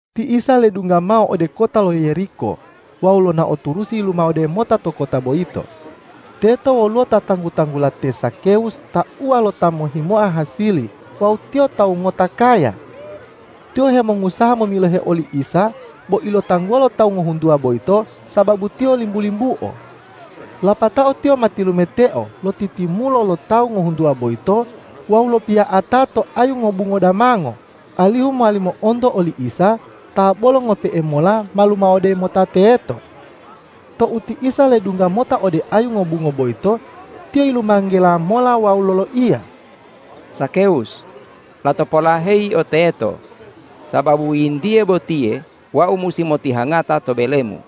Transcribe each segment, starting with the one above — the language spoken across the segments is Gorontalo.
Ti Isa ledungga mao ode kota lo Yeriko wawu lonao turusi yilumawode mota to kota boyito. Teto woluwo ta tanggu-tanggula te Zakewus tauwa lo ta mohhimoa hasili wawu tiyo tawu ngota kaya. Tiyo hemongusaha momilohe oli Isa bo ilotangguwa lo tawu ngohuntuwa boyito sababu tiyo limbu-limbuo. Lapatao tiyo ma tilumeteo lotitimulo lo tawu ngohuntuwa boyito wawu lopiya'ata to ayu ngobungo damango, alihu mowali mo'onto oli Isa ta bolo ngope'e mola ma lumawode mota teto. Tou ti Isa ledungga mota ode ayu ngobungo boyito, Tiyo yilumanggela mola wawu loloiya,”Zakewus, lato polaheyi yio teto, sababu yintiye botiye Wau musi motihangata to belemu.”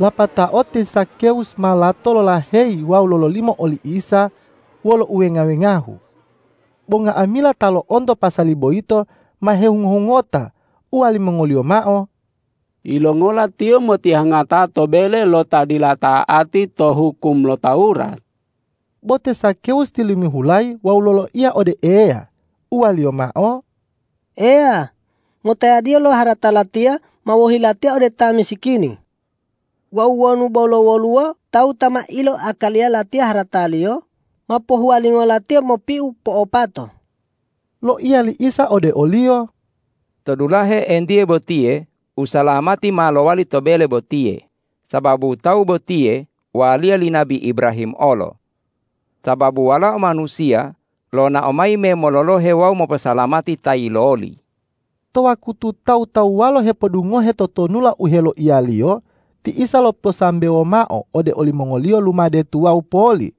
Lapatao te Zakewus ma lato lolaheyi wawu lololimo oli Isa wolo uwenga-wengahu. Bo nga'amila ta lo'onto pasali boyito ma hehungo-hungota, uwalimongoliyo mao,”Yilongola Tiyo motihangata to bele lo ta dila ta'ati to hukum lo Tawurat?” Bo te Zakewus tilimihulayi wawu loloiya ode Eya, uwaliyo mao,”Eya, ngotayadiyo lo harata latiya ma wohi latiya ode ta misikini. Wawu wonu bolo woluwo tawu ta ma iloakaliya latiya harataliyo, ma pohuwalingo latiya mopiu po'opato.” Loiya li Isa ode oliyo,”To dulahe entiye botiye usalamati ma lowali to bele botiye, sababu tawu botiye waliya li nabi Ibrahim olo. Sababu Walao Manusiya lonao mayi me mololohe wawu moposalamati ta yiloli.” To wakutu tawu-tawuwalo hepodungohe totonulalo u heloiya-Liyo, ti Isa loposambewo mao ode olimongoliyo lumade tuwawu poli,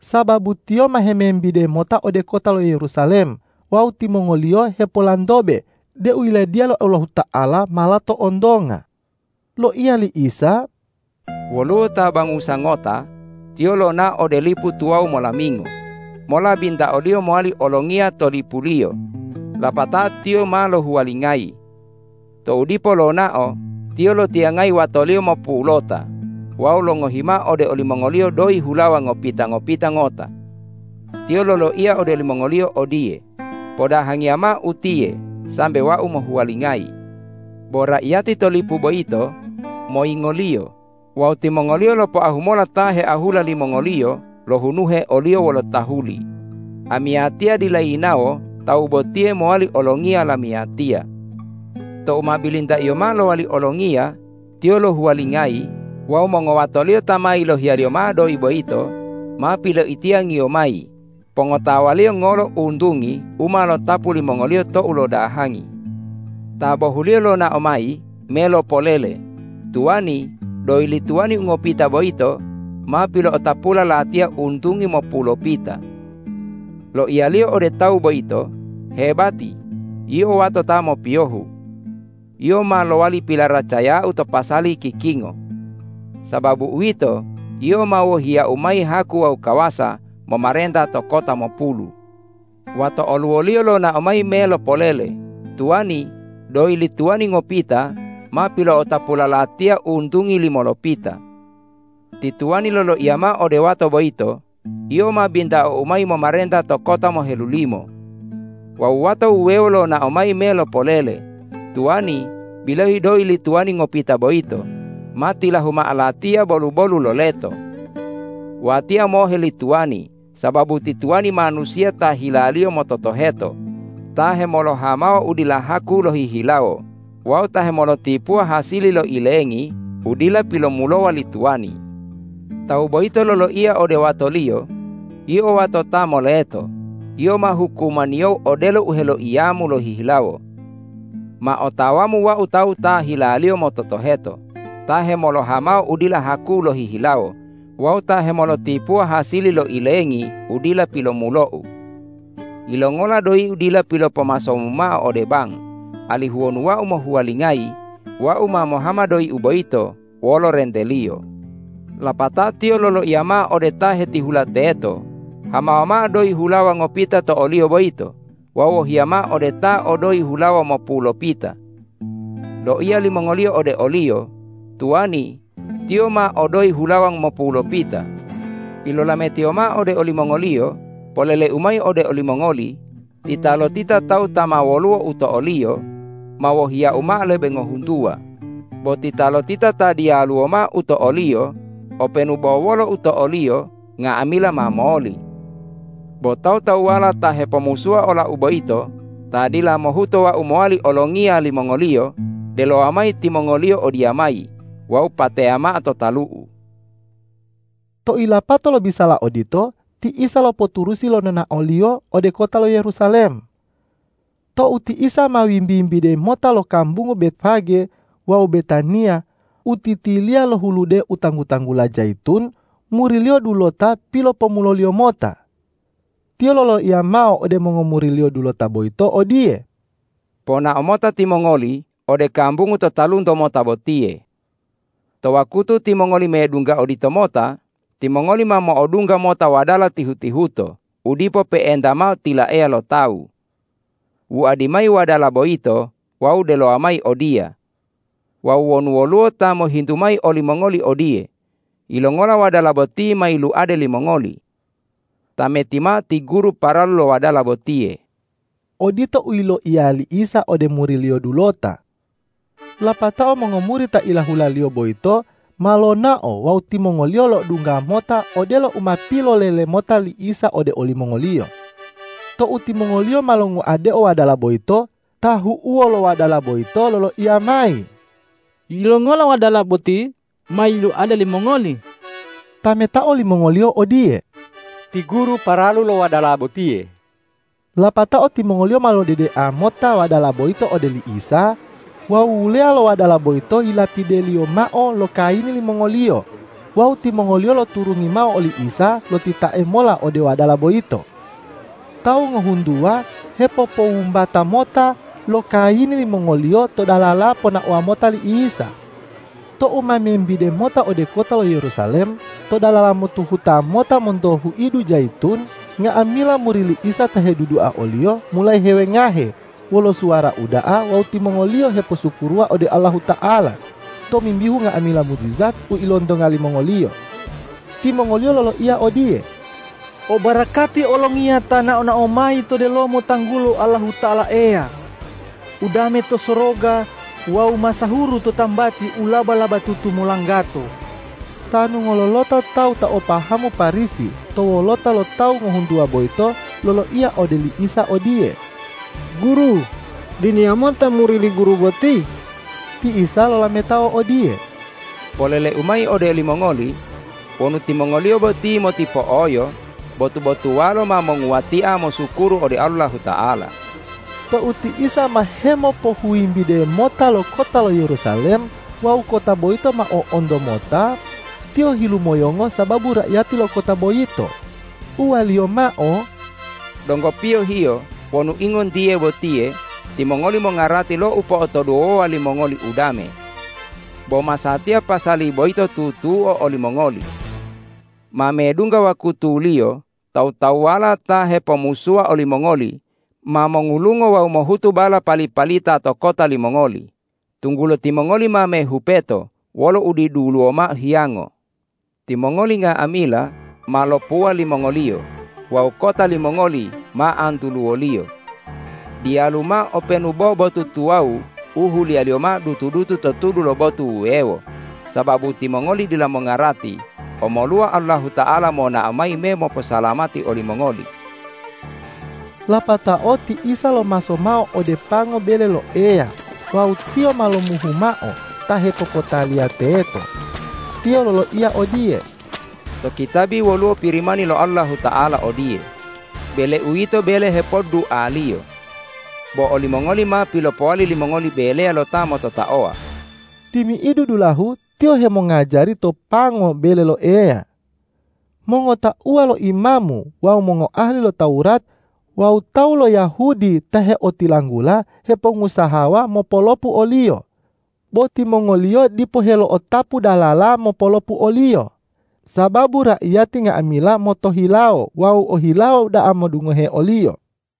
sababu Tiyo ma hemembide mota ode kota lo Yerusalem wawu timongoliyo hepolantobe deu Yiladiya lo Allahuta'ala ma lato ontonga. Loiya li Isa,”Woluwo ta bangusa ngota, Tiyo lonao ode lipu tuwawu molamingo mola bintaoliyo mowali olongiya to lipuliyo, lapatao tiyo ma lohuwalingayi. Tou dipo lonao, tiyo lotiyangayi watoliyo mopulota wawu longohi mao ode olimongoliyo doyi hulawa ngopita-ngopita ngota. Tiyo loloiya ode olimongoliyo odiye, ’Podahangiya mao utiye sambe wau mohuwalingayi.’ Bo raiyati to lipu boyito moyingoliyo wawu timongoliyo lopoahu mola ta heahula limongoliyo lohunuhe oliyo wolo tahuli, ’Amiyatiya dila yinawo tawu botiye mowali olongiya lamiyatiya.’ Tou ma bilintaiyo mao lowali olongiya, tiyo lohuwalingayi wawu mongowatoliyo ta ma yilohiyaliyo mao doyi boyito ma piloitiyangiyo mayi pongotawaliyo ngolo untungi u ma lotapu limongoliyo tou lodahangi. Ta bohuliyo lonao mayi me lopolele, ’Tuwani, doyi li tuwani u ngopita boyito ma pilo'otapula latiya untungi mopulopita.’ Loiyaliyo ode tawu boyito, ’Hebati, yio wato ta mopiyohu! Yio ma lowali pilaracayau to pasali kikingo. Sababu uwito, yio ma wohiyau mayi haku wawu kawasa momarenta to kota mopulu.’ Wato oluwoliyo lonao mayi me mopolele, ’Tuwani, doyi li tuwani ngopita ma pilo'otapula latiya untungi limolopita.’ Ti tuwani loloiya mao ode wato boyito, ’Yio ma bintaou mayi momarenta to kota mohelulimo.’ Wawu wato wuwewo lonao mayi me lopolele, ’Tuwani, bilohi doyi li tuwani ngopita boyito ma tilahu'u mao latiya bolu-bolu lo leto. Watiya mohe li tuwani sababu ti tuwani manusiya ta hilaliyo mototoheto, ta hemolohamawa u dila haku lohihilawo wawu ta hemolotipuwa hasili lo ilengi u dila pilomulowa li tuwani.’ Tawu boyito loloiya ode watoliyo, ’Yio wato ta moleto, yio ma hukumaniyou odelo u heloiyamu lohihilawo. Ma otawamu wau tawu ta hilaliyo mototoheto, ta hemolohamawa u dila haku lohihilawo wawu ta hemolotipuwa hasili lo ilengi u dila pilomulou. Yilongola doyiu dila pilopomasomu mao ode bang, alihu wonu wau mohuwalingayi, wau ma mohama doyiu boyito wolo renteliyo?’ Lapatao tiyo loloiya mao ode ta hetihula teto, ’Hamawa mao doyi hulawa ngopita to oliyo boyito wawu wohiya mao ode ta o doyi hulawa mopulopita.’ Loiya limongoliyo ode oliyo, ’Tuwani, tiyo ma o doyi hulawa mopulopita.’ Pilolametiyo mao ode olimongoliyo, ’Poleleu mayi ode olimongoli: Titalotita tawu ta ma woluwo u to oliyo ma wohiyau mao lebe ngohuntuwa; bo titalotita ta diyaluwo mao u to oliyo, openu bo wolo u to oliyo nga'amila ma moli. Bo tawu-tawuwala ta hepomusuwa olau boyito, ta dila mohuto wau mowali olongiya limongoliyo, delowa mayi timongoliyo odiyamayi wawu pateya mao to talu'u!’” Tou yilapato lobisala odito, ti Isa lopoturusi lo nonao-Liyo ode kota lo Yerusalem. Tou ti Isa ma wimbi-wimbide mota lo kambungu Betfage wawu Betaniya, u titiliya lo hulude u tanggu-tanggula Jayitun, muri-Liyo dulota pilopomulo-Liyo mota. Tiyo loloiya mao ode mongomuri-Liyo dulota boyito odiye,”Ponao mota timongoli ode kambungu to talunto mota botiye. To wakutu timongoli medungga oditomota, timongoli ma mo'odungga mota wadala tihu-tihuto, u dipo pe'enta mao tilaeya lo tawu. Wuadi mayi wadala boyito wawu delowa mayi odiya. Wawu wonu woluwo ta mohintu mayi olimongoli odiye, ’Yilongola wadala boti ma yiluade limongoli?’ Tameti mao ti Guru paralu lo wadala botiye.” Odito u yiloiya li Isa ode muri-Liyo dulota. Lapatao mongomuri ta ilahula-Liyo boyito ma lonao wawu timongoliyo lo'odungga mota odelo u ma pilolele mota li Isa ode olimongoliyo. Tou timongoliyo ma longuadeo wadala boyito, tahu'uwo lo wadala boyito loloiya mayi,”Yilongola wadala boti ma yiluade limongoli?” Tametao limongoliyo odiye,”Ti Guru paralu lo wadala botiye.” Lapatao timongoliyo ma lodedea mota wadala boyito ode li Isa, wawu wuleya lo wadala boyito yilapideliyo mao lo kayini limongoliyo wawu timongoliyo loturungi mao oli Isa lotitae mola ode wadala boyito. Tawu ngohuntuwa hepopowumbata mota lo kayini limongoliyo to dalala ponaowa mota li Isa. Tou ma membide mota ode kota lo Yerusalem, to dalala motuhuta mota monto huidu Jayitun, nga'amila muri li Isa ta hedudua o-Liyo mulayi hewengahe wolo suwara uda'a wawu timongoliyo heposukuruwa ode Allahuta'ala tomimbihu nga'amila mujijat u ilontonga limongoliyo. Timongoliyo loloiya odiye,”O barakati Olongiya ta nao-nao mayi to delomo tanggulo Allahuta'ala Eya! Udame to soroga wawu masahuru to tambati u laba-labatutu molanggato!” Tanu ngololota tawu ta o pahamu Parisi to wolota lo tawu ngohuntuwa boyito loloiya ode li Isa odiye,”Guru, diniya mota muri li Guru boti.” Ti Isa lolametao odiye,”Polele-U mayi ode olimongoli: Wonu timongoliyo boti motipo'oyo, botu-botuwalo ma monguwatia mosukuru ode Allahuta'ala.” Tou ti Isa ma hemopohuwimbide mota lo kota lo Yerusalem wawu kota boyito ma o'onto mota, Tiyo hilumoyongo sababu raiyati lo kota boyito, uwa-Liyo mao,”Donggo piyohiyo wonu ingontiye botiye timongoli mongarati lo upo'otoduwowa limongoli udame. Bo masatiya pasali boyito tutuo olimongoli. Ma medungga wakutuliyo tawu-tawuwala ta hepomusuwa olimongoli ma mongulungo wawu mohutu bala pali-palita to kota limongoli, tunggulo timongoli ma mehupeto wolo udiduluwo mao hiyango. Timongoli nga'amila ma lopuwa limongoliyo wawu kota limongoli ma antuluwoliyo. Diyalu mao openu bo botu tuwawu u huliyaliyo mao dutu-dutu to tudu lo botu wuwewo, sababu timongoli dila mongarati omoluwa Allahuta'ala monao mayi me moposalamati olimongoli.” Lapatao ti Isa lomaso mao ode pango bele lo Eya wawu Tiyo ma lomuhu mao ta hepopotaliya teto. Tiyo loloiya odiye,”To kitabi woluwo Pirimani lo Allahuta'ala odiye, ’Bele-U yito bele hepoddualiyo.’ Bo olimongoli ma pilopowali limongoli beleya lo ta mototaowa!” Timi'idu dulahu Tiyo hemongajari to pango bele lo Eya. Mongotauwa lo imamu wawu mongoahali lo Tawurat wawu tawu lo Yahudi ta heotilanggula, hepongusahawa mopolopu o-Liyo, bo timongoliyo dipo helo'otapu dalala mopolopu o-Liyo, sababu raiyati nga'amila motohilawo wawu ohilawo da'a modungohe o-Liyo.